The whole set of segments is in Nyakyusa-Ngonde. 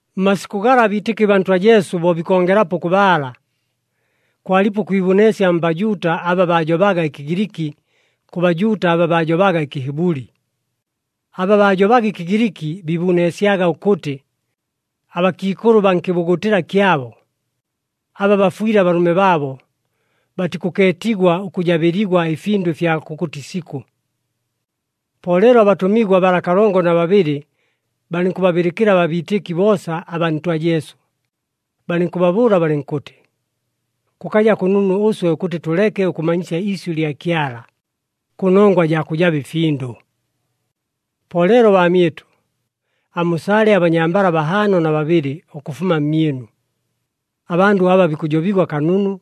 Mmasikʉ gala abiitɨki baa Ntwa Jesu bo bikongelapo ʉkʉbaala, kwalipo ʉkwibuneesya mBajuuta aba baajobaga ɨKɨgiliki kʉ Bajuuta aba baajobaga ɨKɨhibʉli. Aba baajobaga ɨKɨgiliki biibuneesyaga ʉkʉtɨ, abakiikʉlʉ baa nkɨbugutɨla kyabo, aba bafwɨle abalʉme baabo, batikʉkeetigwa ʉkʉjabɨligwa ɨfindʉ ɨfya kʉkʉtɨ isikʉ. Po leelo abatʉmigwa bala kalongo na babɨlɨ balɨnkʉbabɨlɨkɨla abiitɨki boosa abaa Ntwa Jesu, balɨnkʉbabʉʉla balɨnkʉtɨ, “Kʉkaja kʉnunu ʉswe ʉkʉtɨ tʉleke ʉkʉmanyisya iisyʉ lya Kyala, kʉnongwa jaa kʉjaba ɨfindʉ. Po leelo baamyɨtʉ, amusale abanyambala bahaano na babɨlɨ ʉkʉfuma mmyɨnu, abandʉ aba bikʉjobigwa kanunu,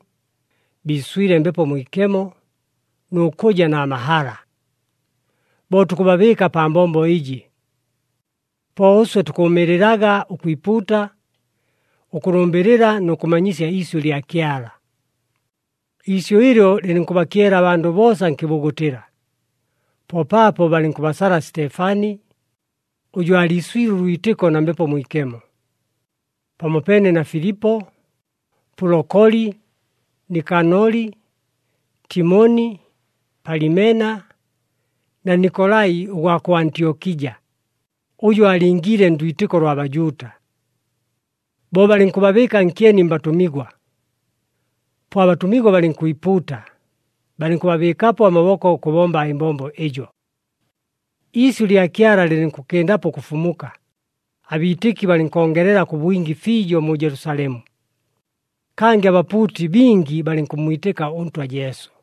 biiswile Mbepo Mwikemo, nʉ kʉja na mahala. Bo tukʉbabɨɨka pa mbombo ɨjɨ. Po ʉswe tukʉʉmɨɨlɨlaga ʉkwipuuta, ʉkʉlʉmbɨlɨla nʉ kʉmanyisya iisyʉ lya Kyala.” Iisyʉ ɨlyo lɨlɨnkʉbakyela abandʉ boosa nkɨbugutɨla, po paapo balɨnkʉbasala Sitefani, ʉjʉ aaliiswile ʉlwitɨko na Mbepo Mwikemo, pamopeene na Filipo, Pulokoli, Nikanoli, Timoni, Palimena na Nikolai ʉgwa kʉ Antyokija, ʉjʉ aalingiile ndwitɨko lwa Bajuuta. Bo balɨnkʉbabɨɨka nkyeni mbatʉmigwa, po abatʉmigwa balɨnkwipuuta, balɨnkʉbabɨɨkapo amaboko ʉkʉbomba ɨmbombo ɨjo. Iisyʉ lya Kyala lɨlɨnkʉkɨndapo ʉkʉfumuka, abiitɨki balɨnkongelela kʉ bwingi fiijo mu Jelusalemu, kangɨ abapuuti bingi balɨnkʉmmwitɨka ʉNtwa Jesu.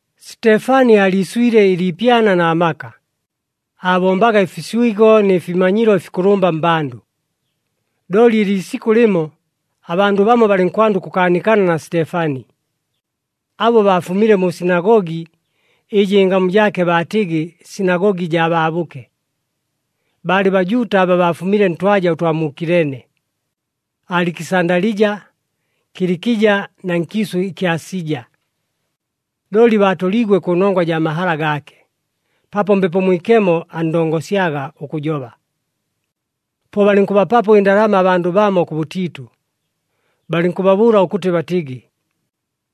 Sitefani aaliiswile ɨliipyana na maka, aabombaga ɨfiswigo nɨ fimanyilo ɨfikʉlʉmba mmbandʉ. Looli ɨliisikʉ lɨmo, abandʉ bamo balɨnkwanda ʉkʉkaanikana na Sitefani. Abo baafumile mu sinagogi, ɨjɨ ɨngamu jaake baatɨgɨ, Sinagogi jaa Baabʉke. Baalɨ Bajuuta aba baafumile ntwaja ʉtwa mu Kilene, Alikisandalija, Kilikija na nkiisʉ ɨkya Asija. Looli baatoliigwe kʉnongwa jaa mahala gaake, paapo Mbepo Mwikemo anndongosyaga ʉkʉjoba. Po balɨnkʉbapapo ɨndalama abandʉ bamo kʉbʉtiitʉ, balɨnkʉbabʉʉla ʉkʉtɨ batɨgɨ,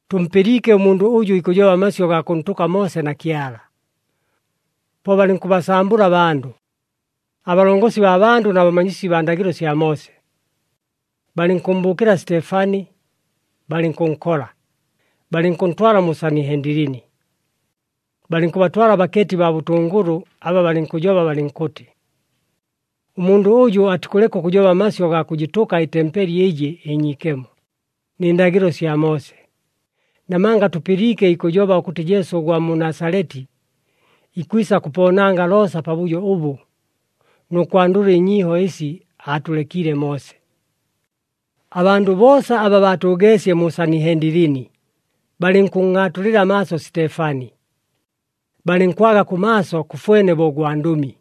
“Tʉmpɨliike ʉmundʉ ʉjʉ ikʉjoba amasyʉ gaa kʉntʉka Moose na Kyala.” Po balɨnkʉbasambʉla abandʉ, abalongosi baa bandʉ na bamanyisi baa ndagɨlo sya Moose. Balɨnkʉmmbʉʉkɨla Sitefani, balɨnkʉnkola, balɨnkʉntwala mu Sanihendilini. Balɨnkʉbatwala abakeeti baa bʉtʉngʉlʉ aba balɨnkʉjoba balɨnkʉtɨ, “Ʉmundʉ ʉjʉ atikʉleka ʉkʉjoba amasyʉ gaa kʉjɨtʉka ɨtempeli ɨjɨ ɨnyiikemo, nɨ ndagɨlo sya Moose! Namanga tʉpɨliike ikʉjoba ʉkʉtɨ Jesu ʉgwa mu Nasaleti ikwisa kʉpoonanga loosa pabʉjo ʉbʉ nʉ kwandʉla ɨnyiiho ɨsi aatʉlekiile Moose.” Abandʉ boosa aba baatʉʉgeesye mu Sanihendilini balɨnkʉnngʼaatulɨla amaaso Sitefani, balɨnkwaga kʉmaaso kʉfwene bo ʉgwandʉmi.